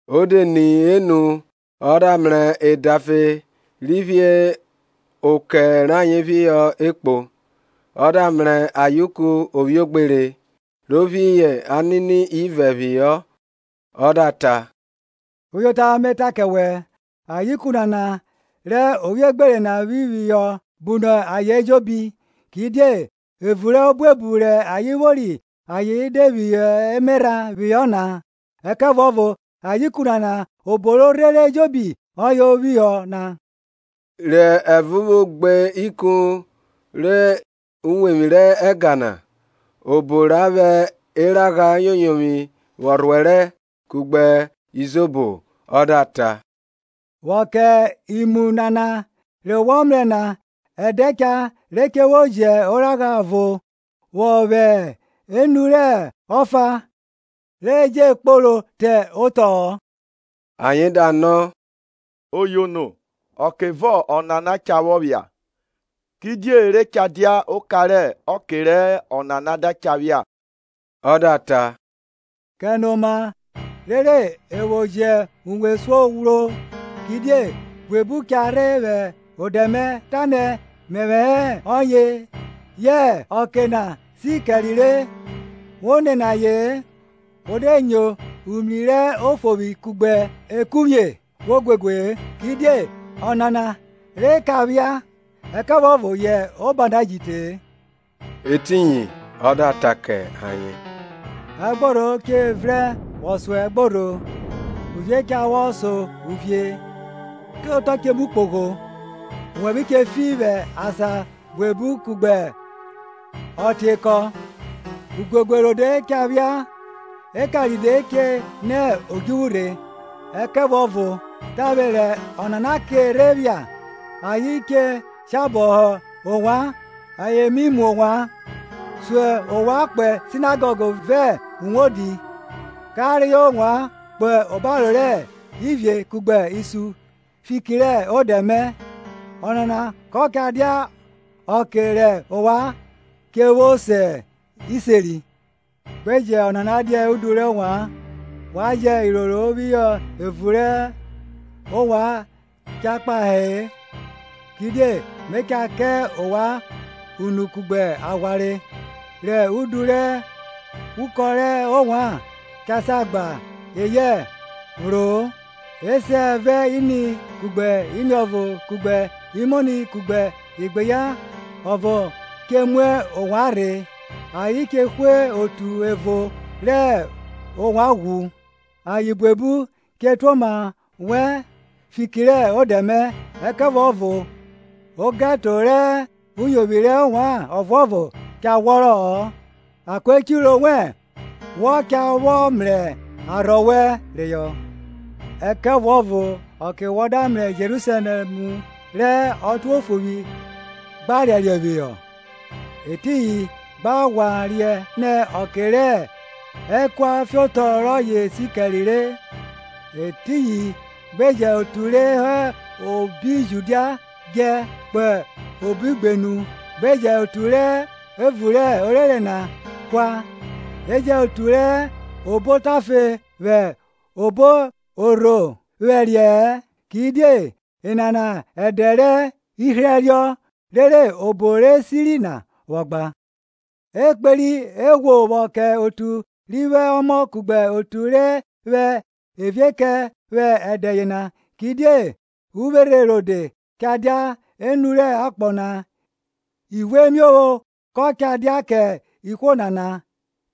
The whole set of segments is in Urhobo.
O de ni enu ọ da mrẹ edafe ri phi okẹ rayen phihọ ekpo; ọ da mrẹ ayeuku ovwiogbere ro phi anini ivẹ phihọ. Ọ da ta, Uyota me ta kẹ wẹ, ayeuku nana rẹ ovwiogbere na phi phihọ bu nọ ayen ejobi Kidie evun rẹ obuebu rẹ ayen vwori ayen de phi emerha phihọ na, ẹkẹvuọvo ayeuku nana obo ri rhere ejobi ọye phihọ na. Rẹ evo vwo gbe ikun rẹ uwevwi rẹ ẹga na, obo ra vwẹ eragha yoyovwi vwọ rhuẹrẹ kugbe izobo, o da ta, vwọ kẹ imu nana re wọ mrẹ na, ẹdẹ cha re che vwo jẹ oragha ọvo vwo vwẹ enu rẹ ọfa re che je kporo te otọ-ọ. Ayen da nọ, Oyono, ọkevọ ọnana cha vwọ phia, kidie re cha dia oka rẹ ọke rẹ ọnana cha vwọ phia? Ọ da ta, Kẹnoma rere e vwo jẹ uwe esuo ghwro; kidie buebu cha rhe vwẹ odẹ mẹ, tanẹ, Mẹvwẹ hẹ ọye! yẹ ọke na si kẹre re! Wo nene aye-en. Wo de nyo umri rẹ ofovwi kugbe ekuvwie, we guegue-e; kidie ọnana re ka phia, ẹkẹvuọvo yẹ oba na ji te-e. Etiyin ọ da ta kẹ ayen, Ẹgborho che vrẹn vwọ so ẹgborho, uvie cha vwọ so uvie; otọ che mu kpogho, owẹvwe che fi vwẹ asan buebu kugbe ọtiekọ; uguegue rode cha phia eka ride che nẹ odjuvwu rhe. Ẹkẹvuọvo tavwe rẹ ọnana ke rhe phia ayen che shabọ họ ovwan ayen mi mu ovwan, sun ovwan kpo sinagọg vẹ uwodi, ka reyọ ovwan kpo obaro rẹ ivie kugbe isun fiki rẹ odẹ mẹ. Ọnana ko cha dia ọke rẹ ovwan che vwo se iseri. Gbe jẹ ọnana dia udu rẹ ovwan, wa jẹ iroro phihọ evun obo rẹ ovwan cha kpahe-e; kidie me cha kẹ ovwan unu kugbe aghwanre, rẹ udu rẹ ukọn rẹ ovwan cha sa gba eyẹ phro-o. Esẹ vẹ ini kugbe iniọvo kugbe imoni kugbe igbeyan ọvo che mu ovwan rhe, ayen che hwe otu ẹvo rẹ ovwan ghwu; ayen buebu che tuoma wẹ fiki rẹ odẹ mẹ. Ẹkẹvuọvo ogẹto rẹ uyovwi rẹ ovwan ọvuọvo cha ghwọrọ-ọ. Akoechiro wẹn wọ cha vwọ mrẹ arhọ wẹn reyọ. Ẹkẹvuọvo ọke wọ da mrẹ Jerusalẹm rẹ otuofovwi gba riariẹ phihọ, etiyin gba ghwa riẹn nẹ ọke rẹ ẹkua fiotọ rọye si kẹre re. Etiyin gbe jẹ otu re hẹ obi Judia djẹ kpo obo igbenu, gbe jẹn otu re hẹ evun rẹ orere na kua, e jẹn otu re hẹ obo otafe vwẹ obo orho vwẹriẹ-ẹ; Kidie enana ẹdẹ rẹ ihriẹriọ, rere obo re siri na vwọ gba. E kperi eghwo vwọ kẹ otu ri vwo ọmọ kugbe otu re vwẹ evie kẹ vwẹ ẹdẹ yena! Kidie uvwerhe rode cha dia enu rẹ akpọ na ivuemiovwo kọ cha dia kẹ ihwo nana;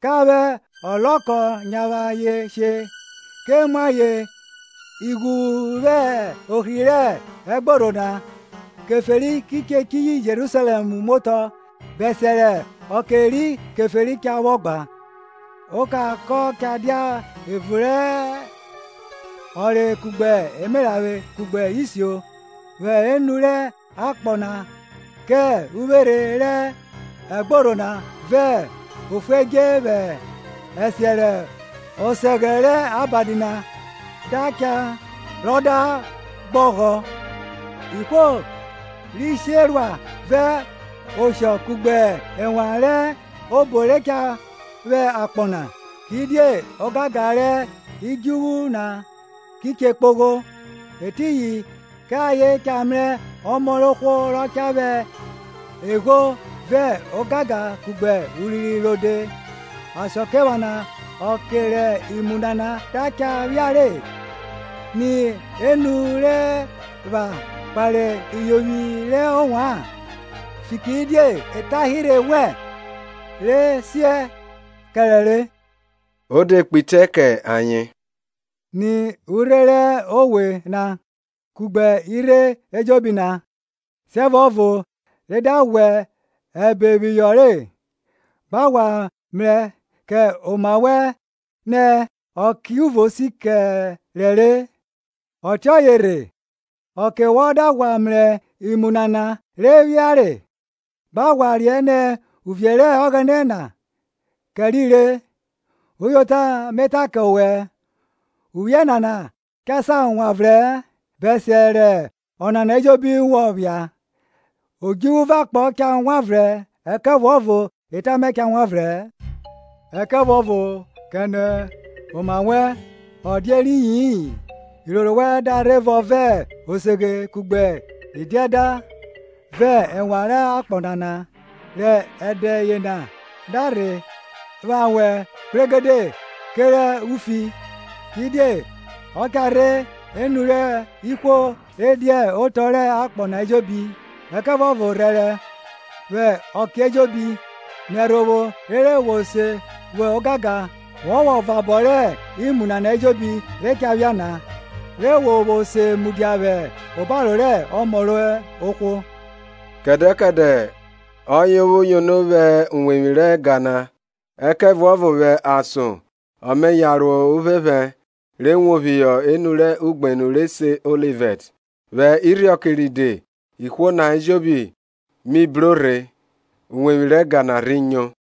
Ka vwẹ ọlọkọ nyavwe ayen she, ke mu ayen ighuvwn vwẹ ohri rẹ ẹgborho na; Keferi ki chiyi Jerusalẹm muotọ, bẹsiẹ rẹ ọke ri Keferi cha vwọ gba. Oka kọ cha dia evun rẹ ọnre kugbe emeranvwe kugbe isio, vwẹ enu rẹ akpọ na kẹ uvwerhe rẹ ẹgborho na vẹ ofuedje vwẹ ẹsiẹ rẹ ọsẹghẹ rẹ abadi da cha rọ da gbogha, ihwo ki sherua vẹ oshọ kugbe ẹnwan rẹ obo re cha vwẹ akpọ na; kidie ogangan rẹ idjuvwu na ki che kpogho. Etiyin kẹ ayen cha mrẹ Ọmọ rẹ ohwo rọ cha vwẹ egho vẹ ogangan kugbe urinrin rode. Asakiephana ọke rẹ imu nana da cha phiare, ni enu re wa kpare iyovwi rẹ ovwan, fikiridie etanhirhe wẹn re siẹ kẹrẹ re. O de kpe itẹ kẹ ayen. Ni urhe rẹ owe na, kugbe irhe ejobi na; siẹvuọvo re da ghwẹ ẹbe phihọ re, gba ghwa mrẹ kẹ oma wẹn nẹ okẹ uvo si kẹre re. Ọtiọye rhe, ọke wọ da ghwa mrẹ imu nana re phiare, gba ghwa riẹn nẹ uvie rẹ Ọghẹnẹ na kẹri re. Uyota, me ta kẹ owẹ, uvwie nana cha sa wanvrẹ-ẹn bẹsiẹ rẹ enana ejobi vwọ phia. Odjuvwu vẹ akpọ cha wanvrẹn, ẹkẹvuọvo eta mẹ cha wanvrẹ-ẹn. Ẹkẹvuọvo kẹnoma wẹn ọ dia eriyi-in iroro wẹn da rhe vọn vẹ oseghe kugbe idiẹda vẹ enwan rẹ akpọ nana, rẹ ẹdẹ yena da rhe vwa wẹ kpregede kerẹ ufi; Kidie ọ cha rhe enu rẹ ihwo re dia otọ rẹ akpọ na ejobi. Ẹkẹvuọvo rhẹrẹ vwẹ ọke ejobi, nẹ ẹrhovwo rere wo se vwo ogangan wọ vwọ vabọ rẹ imu nana ejobi re cha phia na, re wo vwo se mudia vwẹ obaro rẹ Ọmọ rẹ ohwo. Kẹdẹ kẹdẹ kọye o vwo yono vwẹ uwevwi rẹ ẹga na, ẹkẹvuọvo vwẹ ason ọ me yan ro uphẹphẹ re wo phihọ enu rẹ ugbenu re se Olivẹt. Vwẹ irhiọke ride ihwo na ejobi mi bro rhe uwevwi rẹ ẹga na rhi nyo.